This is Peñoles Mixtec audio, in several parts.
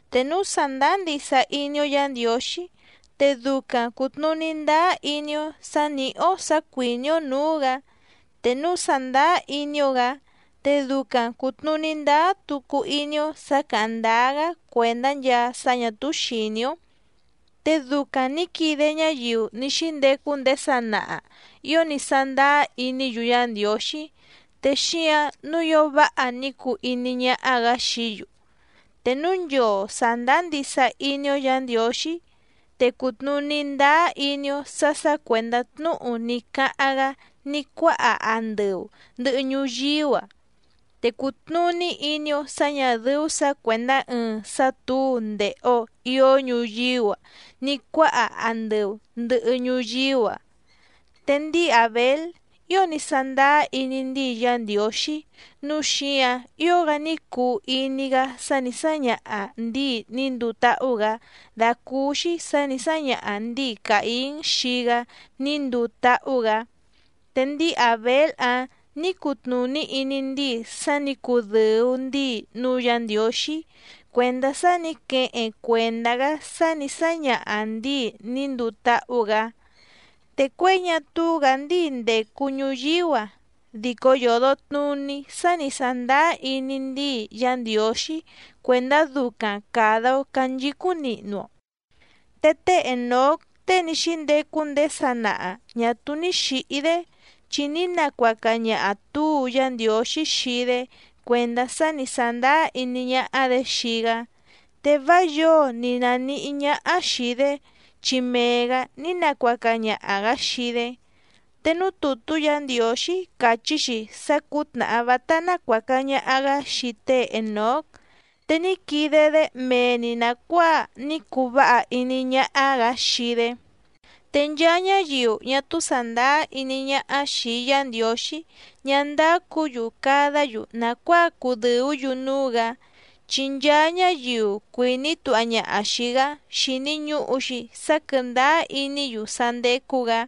Te núu sàndáá ndisa iní‑ó Yǎ Ndiǒxí te ducaⁿ cùtnuní ndáá iní‑ó sǎ nìhí‑ó sǎ cuìní‑ó nǔú‑gǎ. Te núu sàndáá iní‑ó‑gǎ te ducaⁿ cùtnuní ndáá tucu iní‑ó sǎ càháⁿ ndáá‑gá cuèndá nchaa sá ñà túú xìní‑ó. Te ducaⁿ nǐ quide ñáyiu ní xíndecu ndéé sanaha ío ní sándáá iní‑yu Yá Ndiǒxí te xíǎⁿ nǔu ío váha ní cuu iní ñáhá‑gǎ xií‑yu. Te núu nchoo sàndáá ndisa iní‑ó Yǎ Ndiǒxí te cùtnuní ndáá iní‑ó sǎ sǎ cuèndá tnúhu ní cáháⁿ‑gá ní cuáha andɨu ndɨ̀hɨ ñuyíú‑a. Te cùtnuní iní‑ó sǎ ñà dɨ́ú sǎ cuèndá ɨɨⁿ sá tǔu ndèhe‑o ió ñuyíú‑a ní cuáha andɨu ndɨ̀hɨ ñuyíú‑a. Te ndíi Àbél ío ní sándáá iní ndíi Yá Ndiǒxí nǔu xíǎⁿ ío‑gá ní cuu iní‑gá sá nǐ sáñaha ndǐi ní nduu táhú‑gǎ dàcúúxí sǎ nǐ sáñaha ndǐi Càín xii‑gá ní nduu táhú‑gǎ. Te ndíi Àbél‑áⁿ nǐ cutnùní iní ndíi sá nǐ cudɨ̀u ndíi núú Yǎ Ndiǒxí cuèndá sá nǐ queheⁿ cuèndá‑gá sá nǐ sáñaha ndǐi ní nduu táhú‑gǎ. Te cuěi ñá túú‑gǎ ndíi ndècu ñuyíú‑a dico yòdo tnuní sá nǐ sándáá iní ndíi Yá Ndiǒxí cuèndá ducaⁿ càda‑o canchicúⁿ nihnu‑o. Te té Ènóc tée ní xíndecu ndéé sanaha ñà túú ní xǐhí‑dé chi ní nacuaca ñaha túu Yá Ndiǒxí xii‑dé cuèndá sá nǐ sándáá iní ñáhá‑dě xii‑gá. Te vá yǒo ni nànihí ñáhá xìi‑dé chi mee‑gǎ ní nacuaca ñaha‑gǎ xii‑dé. Te núú tùtú Yǎ Ndiǒxí càchí‑xi sá cǔtnàhá vátá nácuàca ñaha‑gá xii té Ènóc, te ní quide‑dé mee‑ni nàcuáa ní cuu váha iní ñáhá‑gǎ xii‑dé. Te nchaa ñáyiu ñá túú sàndáá iní ñáhá xìi Yá Ndiǒxí ñá ndácǔ‑yu cadá‑yu nàcuáa cudɨ̀ú‑yu núú‑gǎ, chi nchaa ñáyiu cuìní tuha ñaha xìi‑gá xíní ñùhu‑xi sá quɨ̀ndáá iní‑yu sá ndécú‑gǎ,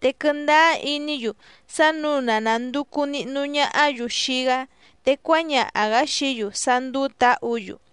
te quɨndáá iní‑yu sá nǔu na nànducu nihnu ñahá‑yu xii‑gá te cuáñaha‑gǎ xií‑yu sá ndúú tǎhǔ‑yu.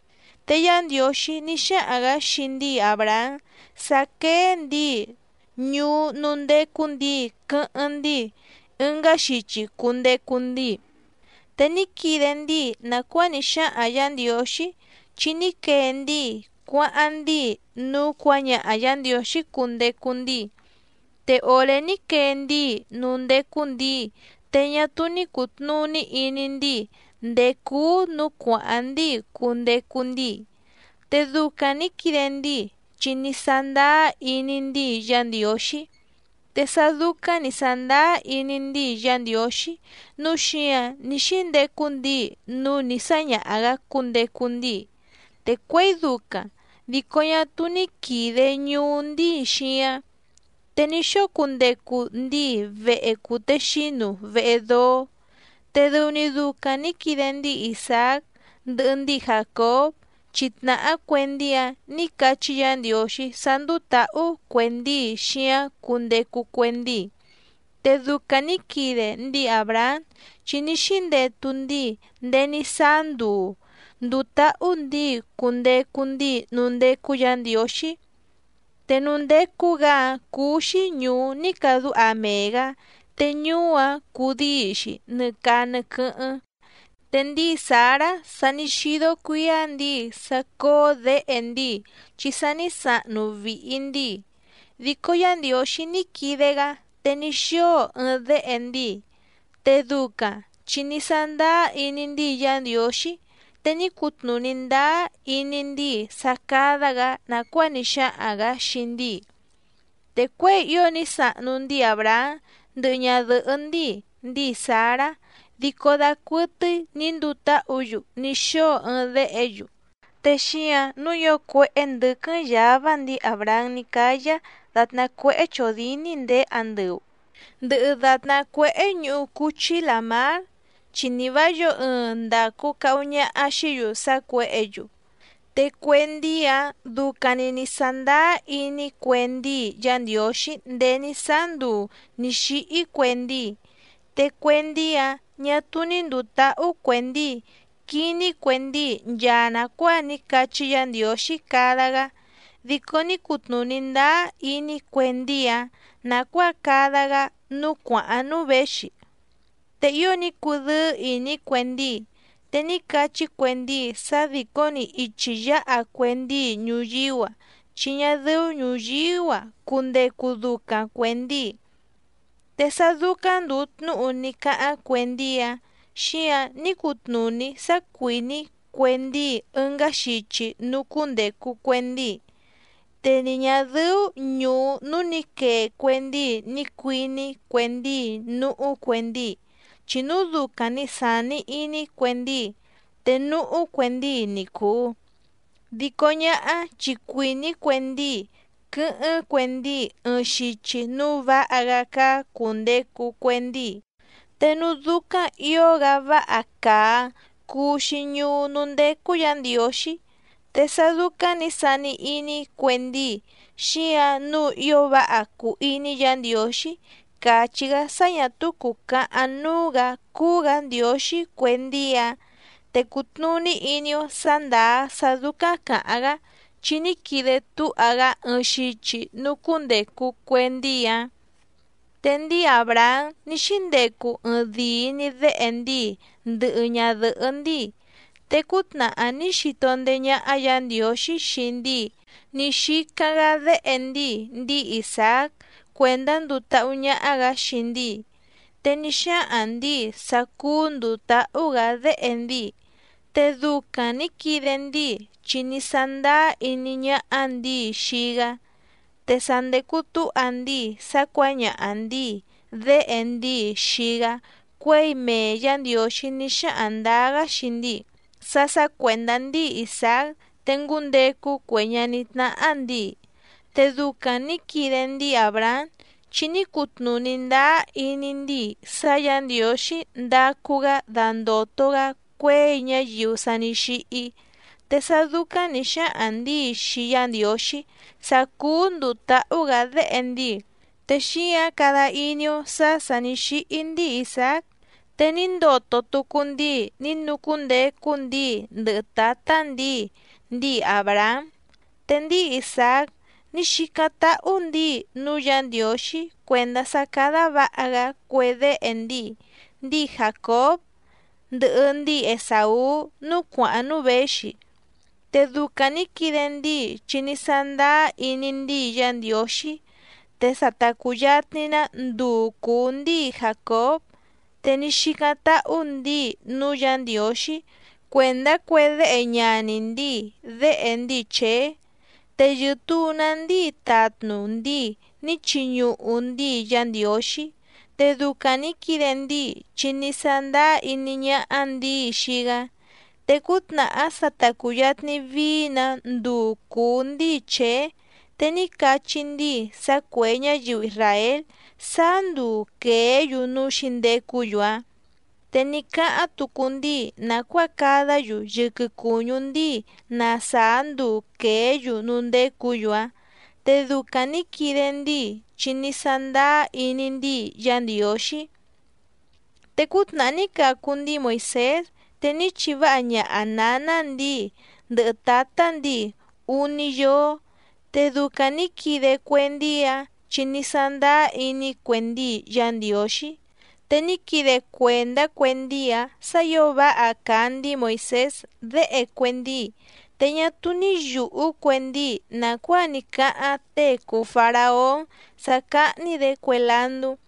Te Yá Ndiǒxí ní xáhaⁿ‑gǎ xii ndíi Àbrahám sá quéé ndǐi ñuú núú ndécú ndǐi quɨ́hɨ́ⁿ ndíi ɨngá xichi cundecu ndíi. Te ní quide ndíi nàcuáa ní xáhaⁿ Yǎ Ndiǒxí chi ní quee ndíi cuáháⁿ ndíi núú cuǎñaha Yǎ Ndiǒxí cundecu ndíi. Te òré ní quee ndíi núú ndécú ndǐi te ñá túú ní cùtnuní iní ndíi ndèé cúú nǔú cuàháⁿ ndíi cundecu ndíi. Te ducaⁿ nǐ quide ndíi chi ní sándáá iní ndíi Yá Ndiǒxí. Te sá dúcáⁿ nǐ sándáá iní ndíi Yá Ndiǒxí nǔu xíǎⁿ ní xíndecu ndíi núú nǐ sáñaha‑gǎ cundecu ndíi, te cuěi ducaⁿ dico ñá túú ní quìde ñuú ndíi xíáⁿ. Te ní xóo cundecu ndíi vehe cùtexínu vehe dóó. Te dɨu‑ni ducaⁿ nǐ quide ndíi Isàác ndɨhɨ ndíi Jàcób chi tnàhá cue ndíi‑áⁿ nǐ cachí Yǎ Ndiǒxí sá ndúú tǎhú cue ndíi xíáⁿ cundecu cue ndíi. Te ducaⁿ nǐ quide ndíi Àbrahám chi ní xíndetu ndíi ndéé ní sáá nduu ndùu táhú ndǐi cundecu ndíi núú ndécú Yǎ Ndiǒxí. Te núú ndécú‑gǎ‑áⁿ cúú‑xí ñùú ní cadúha mee‑gǎ, te ñuú‑áⁿ cudíi‑xi nɨ caa nɨ quɨ́hɨ́ⁿ. Te ndíi Sǎrá, sa ní xídó cuǐá ndǐi sá cóó děhe ndíi chi sa ní sahnu vìhi ndíi, dico Yá Ndiǒxí ní quide‑gá te ní xóo ɨɨⁿ déhe ndíi. Te ducaⁿ chi ní sándáá iní ndíi Yá Ndiǒxí te ní cutnùní ndáá iní ndíi sá cádá‑gǎ nàcuáa ní xáhaⁿ‑gǎ xii ndíi. Te cuěi ío ní sahnu ndíi Àbrahám ndɨhɨ ñadɨ̀hɨ́ ndíi, ndíi Sǎrá dico dacuɨtɨ́í nǐ nduu táhǔ‑yu ní xóo ɨɨⁿ déhe‑yu. Te xíǎⁿ nǔu ío cuéhé ndɨ̌quɨ́ⁿ yǎvá ndíi Àbrahám ní cáyá dàtná cuéhé chòdíní ndèé andɨu, ndɨhɨ dàtná cuéhé ñuhu cúchí làmár, chi ni vǎ yǒo ɨɨⁿ ndacu cahu ñaha xìí‑yu sá cuěhě‑yu. Te cue ndíi‑áⁿ ducaⁿ‑ni nǐ sándáá iní cue ndíi Yá Ndiǒxí ndéé ní sáá nduu nǐ xíhí cue ndíi. Te cue ndíi‑áⁿ ñà túú ní ndùu táhú cue ndíi quiní cue ndíi nchaa nàcuáa ní cachí Yǎ Ndiǒxí cada‑gá, dico ní cutnùní ndáá iní cue ndíi‑áⁿ nàcuáa cada‑gá núú cuàháⁿ núú věxi. Te ío ní cudɨ́ɨ́ ìní cue ndíi, te ní cachí cue ndíi sá dìcó‑ni ichi yáha cue ndíi ñuyíú‑a, chi ñá dɨ́ú ñùyíú‑a cundecu ducaⁿ cuè ndíi. Te sá dúcáⁿ ndùu tnúhu ní cáháⁿ cue ndíi‑áⁿ, xíǎⁿ ní cutnùní sá cuìní cue ndíi ɨngá xichi núú cúndècu cue ndíi. Te ni ñà dɨ́ú ñùú núú nǐ quee cue ndíi ni cuìní cue ndíi núhú cue ndíi. Chi núu ducaⁿ ni sàni iní cue ndíi te núhú cue ndíi ni cùu. Dico ñáhá chi cuìní cue ndíi quɨ́hɨ́ⁿ cue ndíi ɨɨⁿ xichi núú vǎha‑gá cáá cùndecu cue ndíi. Te núú dúcáⁿ ǐo‑gá váha càa‑áⁿ cúú‑xí ñùú núú ndécú Yǎ Ndiǒxí, te sá dúcáⁿ nǐ sani iní cue ndíi xíǎⁿ nǔu ío váha cùu iní Yǎ Ndiǒxí càchí‑gá sá ñà túú cùcahaⁿ núú‑gǎ cúú‑gǎ Ndiǒxí cue ndíi‑áⁿ, te cùtnuní iní‑ó sǎ ndàá sá dúcáⁿ càháⁿ‑gá chi ní quide túha‑gá ɨɨⁿ xichi núú cúndècu cue ndíi‑áⁿ. Te ndíi Àbrahám ní xíndecu ɨɨⁿdìi‑ni déhe ndíi ndɨhɨ ñadɨ̀hɨ́ ndíi, te cútnàhá ní xito ndéé ñáhá Yǎ Ndiǒxí xii ndíi ní xícáⁿ‑gá déhe ndíi, ndíi Isàác cuèndá nduu táhú ñáhá‑gǎ xii ndíi. Te ní xáhaⁿ ndǐi sá cúú ndùu táhú‑gǎ déhe ndíi, te ducaⁿ nǐ quide ndíi chi ní sándáá iní ñáhá ndǐi xii‑gá. Te sa ndècu túha ndíi sá cuǎñaha ndǐi déhe ndíi xii‑gá cuěi mee Yǎ Ndiǒxí ní xáhaⁿ ndǎá‑gá xii ndíi sá sǎ cuèndá ndíi Isàác te ngúndecu cue ñaní tnáhá ndǐi. Te ducaⁿ nǐ quide ndíi Àbrahám, chi ní cutnùní ndáá iní ndíi sá Yǎ Ndiǒxí ndácú‑gǎ dándòto‑gá cuěi ñáyiu sa ní xíhí. Te sá dúcáⁿ nǐ xáhaⁿ ndǐi xii Yá Ndiǒxí sá cúú ndùu táhú‑gǎ déhe ndíi, te xíǎⁿ cada iní‑ó sǎ sà ní xíhí ndíi Isàác te ní ndoto tucu ndíi ní nucúndecu ndíi ndɨhɨ tǎtá ndǐi, ndíi Àbrahám. Te ndíi Isàác ní xícáⁿ táhú ndǐi núú Yǎ Ndiǒxí cuèndá sá cádá vǎha‑gá cue déhe ndíi, ndíi Jàcób ndɨhɨ ndíi Esàú núú cuàháⁿ núú věxi. Te ducaⁿ nǐ quide ndíi chi ní sándáá iní ndíi Yá Ndiǒxí. Te sa ta cùyatni‑ná nduu cùú ndíi Jàcób, te ní xícáⁿ táhú ndǐi núú Yǎ Ndiǒxí cuèndá cue déhe ñaní ndíi déhe ndíi Chèé. Te yɨ̀tuu‑ná ndíi tatnu ndíi ní chiñuhu ndíi Yá Ndiǒxí. Te ducaⁿ nǐ quide ndíi chi ní sándáá iní ñáhá ndǐi xii‑gá. Te cútnàhá sa ta cùyatni vií‑nǎ nduu cùú ndíi Chèé, te ní cachí ndíi sá cuè ñáyiu isràél sáá nduu quèé‑yu núú xǐndecú‑yu‑áⁿ. Te ní cáháⁿ tucu ndíi nàcuáa cadá‑yu yɨquɨ cùñú ndíi na sàá nduu quèé‑yu núú ndécǔ‑yu‑áⁿ. Te ducaⁿ nǐ quide ndíi chi ní sándáá iní ndíi Yá Ndiǒxí. Te cútnàhá ní cacu ndíi Moìsés te ní chiváha ñaha nǎná ndǐi ndɨhɨ tǎtá ndǐi úní yóó. Te ducaⁿ nǐ quide cue ndíi‑áⁿ chi ní sándáá iní cue ndíi Yá Ndiǒxí. Te ní quide cuèndá cue ndíi‑áⁿ sǎ ǐo váha càa ndíi Moìsés déhe cue ndíi, te ñá túú ní yùhú cue ndíi nàcuáa ní cáháⁿ tée cùu Faraón sá cáhní‑dě cue landú.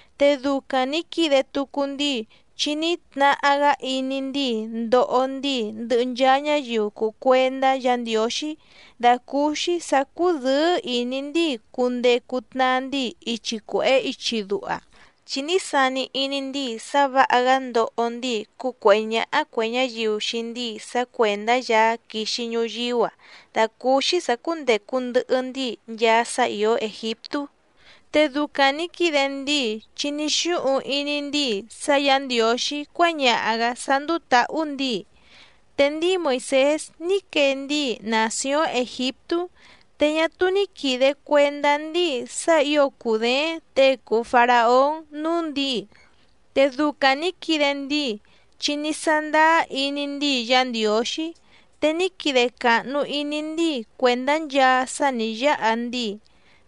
Te ducaⁿ nǐ quide tucu ndíi chi ní tnahá‑gá iní ndíi ndoho ndíi ndɨhɨ nchaa ñáyiu cùu cuendá Yǎ Ndiǒxí dàcúúxí sǎ cúdɨ̌ɨ́ ìní ndíi cundecu tnaa ndíi ichi cuèhé ichi duha. Chi ní sani iní ndíi sá vǎha‑gá ndoho ndíi cúcuèhé ñáhá cuè ñáyiu xii ndíi sá cuèndá Yaá quixi ñuyíú‑a dàcúúxí sǎ cúndècu ndɨhɨ ndíi nchaa sá ìó Ègiptú. Te ducaⁿ nǐ quide ndíi chi ní xúhuⁿ iní ndíi sá Yǎ Ndiǒxí cuáñaha‑gǎ sá ndúú tǎhú ndǐi. Te ndíi Moìsés ní quee ndíi nàcióⁿ Ègiptú te ñá túú ní quìde cuendá ndíi sá ǐo cùdééⁿ těe cùu Faraón núú ndǐi. Te ducaⁿ nǐ quide ndíi chi ní sándáá iní ndíi Yá Ndiǒxí. Te ní quide càhnu iní ndíi cuèndá nchaa sá nǐ yáha ndíi,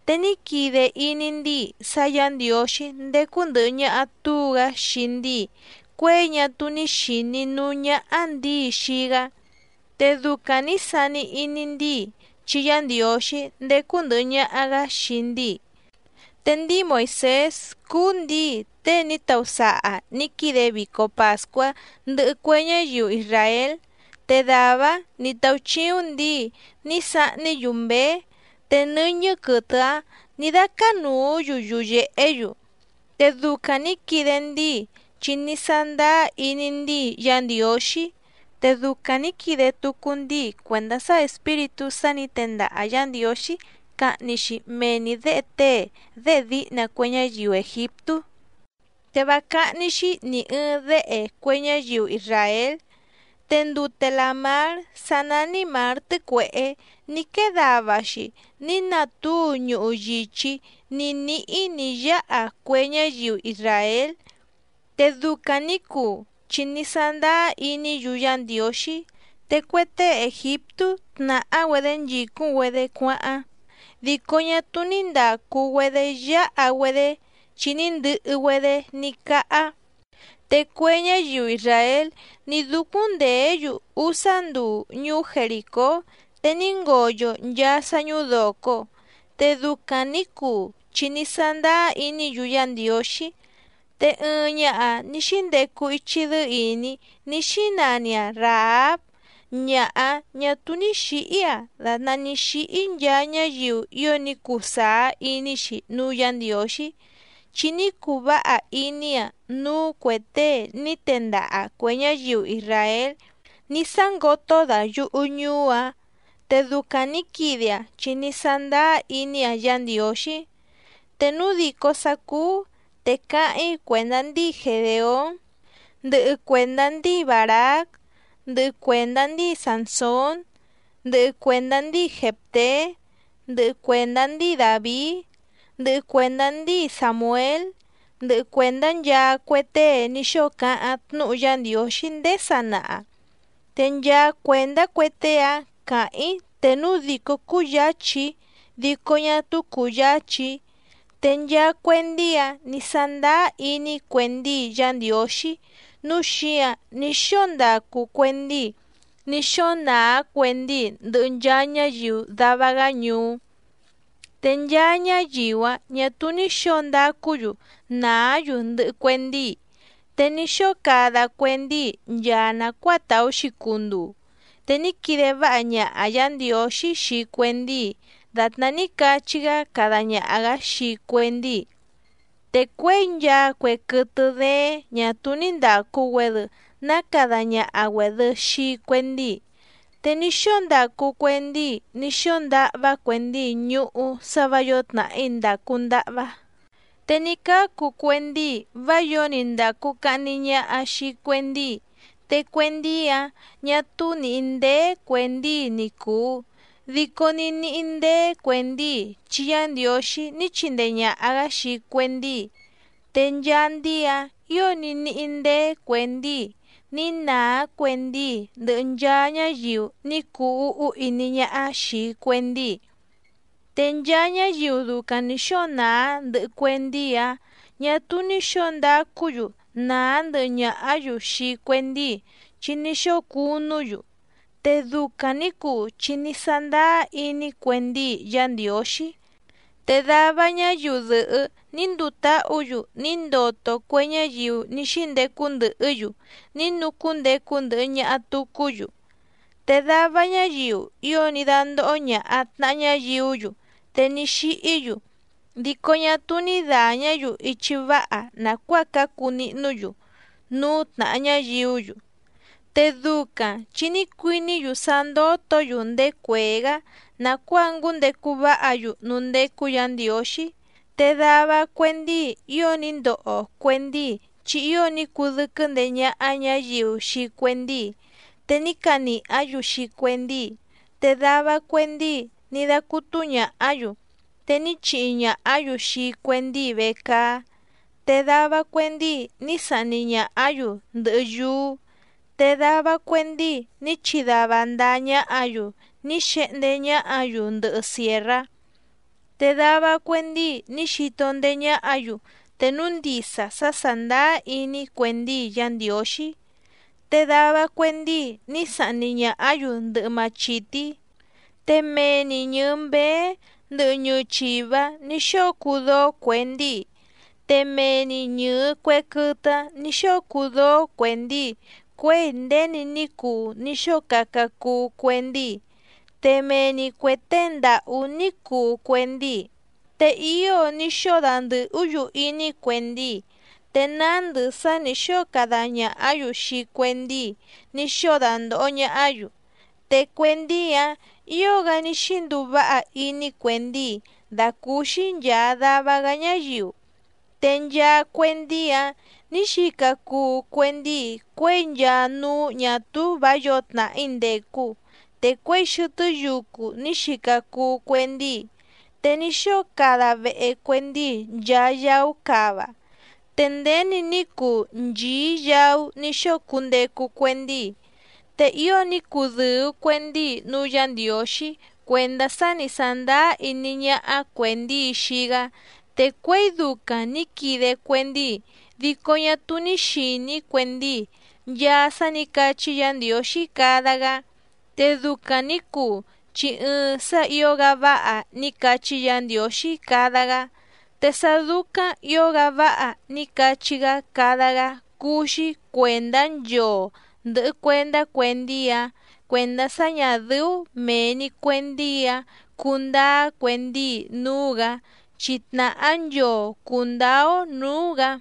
te ní quide iní ndíi sá Yǎ Ndiǒxí ndécú ndɨ̀hɨ ñaha túu‑gá xii ndíi cuěi ñá túú ní xìní núú ñáhá ndǐi xii‑gá. Te ducaⁿ nǐ sani iní ndíi chi Yá Ndiǒxí ndécú ndɨ̀hɨ ñaha‑gá xii ndíi. Te ndíi Moìsés cúú ndǐi tée ní tausaha nǐ quide vico pàscuá ndɨhɨ cue ñáyiu isràél, te dàvá‑áⁿ nǐ táúchíúⁿ ndǐi ní sahní‑yu mběé te nɨ́ñɨ́ quɨtɨ‑áⁿ nǐ dácánùú‑yu yuyèhé‑yu. Te ducaⁿ nǐ quide ndíi chi ní sándáá iní ndíi Yá Ndiǒxí. Te ducaⁿ nǐ quide tucu ndíi cuèndá sá espíritú sá nǐ tendaha Yǎ Ndiǒxí cahni‑xi mee‑ni děhe tée déhe díhna cue ñáyiu Ègiptú, te vá cáhní‑xí nì ɨɨⁿ déhe cue ñáyiu isràél. Te ndute làmár sá nání Mǎr Tɨ́cuèhé ní quée dava‑xi ní natúu ñuhu yìchí ní níhí nǐ yáha cue ñáyiu isràél. Te ducaⁿ nǐ cuu chi ní sándáá iní‑yu Yá Ndiǒxí. Te cue tée Ègiptú tnàhá‑güedé nchìcúⁿ‑güedé cuáháⁿ dico ñá túú ní ndàcu‑güedé yáha‑güedé chi ní ndɨhɨ‑güedé ní cáhá. Te cue ñáyiu isràél ní dúcúⁿ ndèé‑yu úsá nduu ñuú Jerìcó te ní ngoyo nchaa sá ñúdòco. Te ducaⁿ nǐ cuu chi ní sándáá iní‑yu Yá Ndiǒxí. Te ɨɨⁿ ñaha ní xíndecu ichi dɨ́ɨ́ ìní ní xínani‑aⁿ Ràháb, ñaha‑áⁿ ñà túú ní xǐhí‑aⁿ dàtná ní xíhí nchaa ñáyiu ío ní cuu sàá iní‑xi núú Yǎ Ndiǒxí, chi ní cuu váha iní‑aⁿ núú cuè tée ní tendaha cuè ñáyiu isràél ní sángoto dayuhu ñùú‑aⁿ. Te ducaⁿ nǐ quide‑aⁿ chi ní sándáá iní‑aⁿ Yá Ndiǒxí. Te núu dìcó sá cúú te cáháⁿ‑í cuèndá ndíi Gedèón, ndɨhɨ cuèndá ndíi Bàrác, ndɨhɨ cuèndá ndíi Sànsón, ndɨhɨ cuèndá ndíi Jèfté, ndɨhɨ cuèndá ndíi Dàvií, ndɨhɨ cuèndá ndíi Sàmuél, ndɨhɨ cuèndá nchaa cue tée ní xóo cáháⁿ tnúhu Yá Ndiǒxí ndéé sanaha, te nchaa cuèndá cue tée‑áⁿ cǎháⁿ‑í te núu dìcó cúyǎchí‑í dico ñá túú cùyáchí‑í. Te nchaa cue ndíi‑áⁿ ni sàndáá iní cue ndíi Yá Ndiǒxí nǔu xíǎⁿ ní xóo ndacu cue ndíi ní xóo nàá cue ndíi ndɨhɨ nchaa ñáyiu dava‑gá ñuú. Te nchaa ñáyiu‑áⁿ ñà túú ní xǒo ndacú‑yu nàá‑yu ndɨhɨ cue ndíi, te ní xóo cada cue ndíi nchaa nàcuáa tàú‑xi cunduu, te ní quide váha ñaha Yǎ Ndiǒxí xii cue ndíi dàtná ní cachí‑gá cada ñaha‑gǎ xii cue ndíi. Te cuěi nchaa cue quɨtɨ dééⁿ ñà túú ní ndàcu‑güedɨ ná cada ñaha‑güèdɨ xii cue ndíi. Te ní xóo ndacu cue ndíi ní xóo ndahvá cue ndíi ñuhú sá vǎ yǒo tnàhí ndàcu ndahvá, te ní cácu cue ndíi vá yǒo ni ndàcu cahni ñaha xii cue ndíi. Te cue ndíi‑áⁿ ñà túú nìhí ndéé cuè ndíi ni cùu, dico ní níhí ndéé cuè ndíi chi Yá Ndiǒxí ní chindee ñàha‑gá xii cue ndíi, te nchaa ndíi‑áⁿ ǐo ní níhí ndéé cuè ndíi ní nàá cue ndíi ndɨhɨ nchaa ñáyiu ní cuu úhú iní ñáhá xìi cue ndíi, te nchaa ñáyiu ducaⁿ nǐ xóo nàá ndɨhɨ cue ndíi‑áⁿ ñà túú ní xǒo ndacú‑yu nàá ndɨhɨ ñàhá‑yu xii cue ndíi chi ní xóo cunú‑yu. Te ducaⁿ nǐ cuu chi ní sándáá iní cue ndíi Yá Ndiǒxí. Te dava ñáyiu dɨ̀hɨ́ ní nduu táhǔ‑yu ní ndoto cue ñáyiu ní xíndecu ndɨhɨ́‑yu ní nucúndecu ndɨhɨ ñaha tùcú‑yu. Te dava ñáyiu ío ní dándóhó ñàha tnaha ñáyiú‑yu te ní xíhí‑yu, dico ñá túú ní dàñá‑yu ichi váha nàcuáa cácu nihnú‑yu núú tnàha ñáyiú‑yu, te ducaⁿ chi ní cuiní‑yu sá ndótǒ‑yu ndéé cuèé‑gá nàcuáa ngúndecu váha‑yu núú ndécú Yǎ Ndiǒxí. Te dava cue ndíi ío ní ndoho cue ndíi chi ío ní cudɨ́quɨ́ ndeé ñáhá ñǎyiu xii cue ndíi, te ní canìhá‑yu xii cue ndíi, te dava cue ndíi ní dácútú ñàhá‑yu, te ní chihi ñàhá‑yu xii cue ndíi vecaá. Te dava cue ndíi ní sahni ñàhá‑yu ndɨhɨ yúú. Te dava cue ndíi ní chidava ndáá ñáhǎ‑yu ní xehndé ñáhǎ‑yu ndɨhɨ sièrrá. Te dava cue ndíi ní xito ndéé ñáhǎ‑yu te núu ndisa sá sàndáá iní cue ndíi Yá Ndiǒxí, te dava cue ndíi ní sahni ñàhá‑yu ndɨhɨ machìtí. Te mee‑ni ñɨ̀ɨ mbéé ndɨhɨ ñɨɨ chìvá, ní xóo cuu dóó cue ndíi. Te mee‑ni ñɨ̀ɨ cue quɨtɨ‑áⁿ nǐ xóo cuu dóó cue ndíi cuěi nděni ní cuu ní xóo caca cuu cue ndíi. Te mee‑ni cuè tée ndàhú ní cuu cue ndíi. Te ío ní xóo dandɨ̀hú‑yu iní cue ndíi, te nándɨ sá nǐ xóo cada ñàhá‑yu xii cue ndíi ní xóo dandòho ñahá‑yu. Te cue ndíi‑áⁿ ǐo‑gá ní xínduu váha iní cue ndíi dàcúúxí nchàa dava‑gá ñáyiu. Te nchaa cue ndíi‑áⁿ nǐ xica cuu cue ndíi cuěi nchaa núú ñà túú vǎ yǒo tnàhí ndècu, te cuěi xɨtɨ́ yucu ní xica cuu cue ndíi. Te ní xóo cada vehe cue ndíi nchaa yaú cava. Te nděni ní cuu nchìí yaú ní xóo cundecu cue ndíi. Te ío ní cudɨ̀u cue ndíi núú Yǎ Ndiǒxí cuèndá sá ni sàndáá iní ñáhá cuè ndíi xii‑gá. Te cuěi ducaⁿ nǐ quide cue ndíi dico ñá túú ní xìní cue ndíi nchaa sá nǐ cachí Yǎ Ndiǒxí cada‑gá. Te ducaⁿ nǐ cuu chi ɨɨⁿ sá ǐo‑gá váha ní cachí Yǎ Ndiǒxí cada‑gá. Te sá dúcáⁿ ǐo‑gá váha ní cachí‑gá cada‑gá cúú‑xí cuèndá nchoo ndɨ̀hɨ cuendá cue ndíi‑áⁿ cuèndá sá ñà dɨ́ú mèe‑ni cue ndíi‑áⁿ cundáá cue ndíi núú‑gǎ, chi tnàhá nchoo cùndáá‑ó nǔú‑gǎ.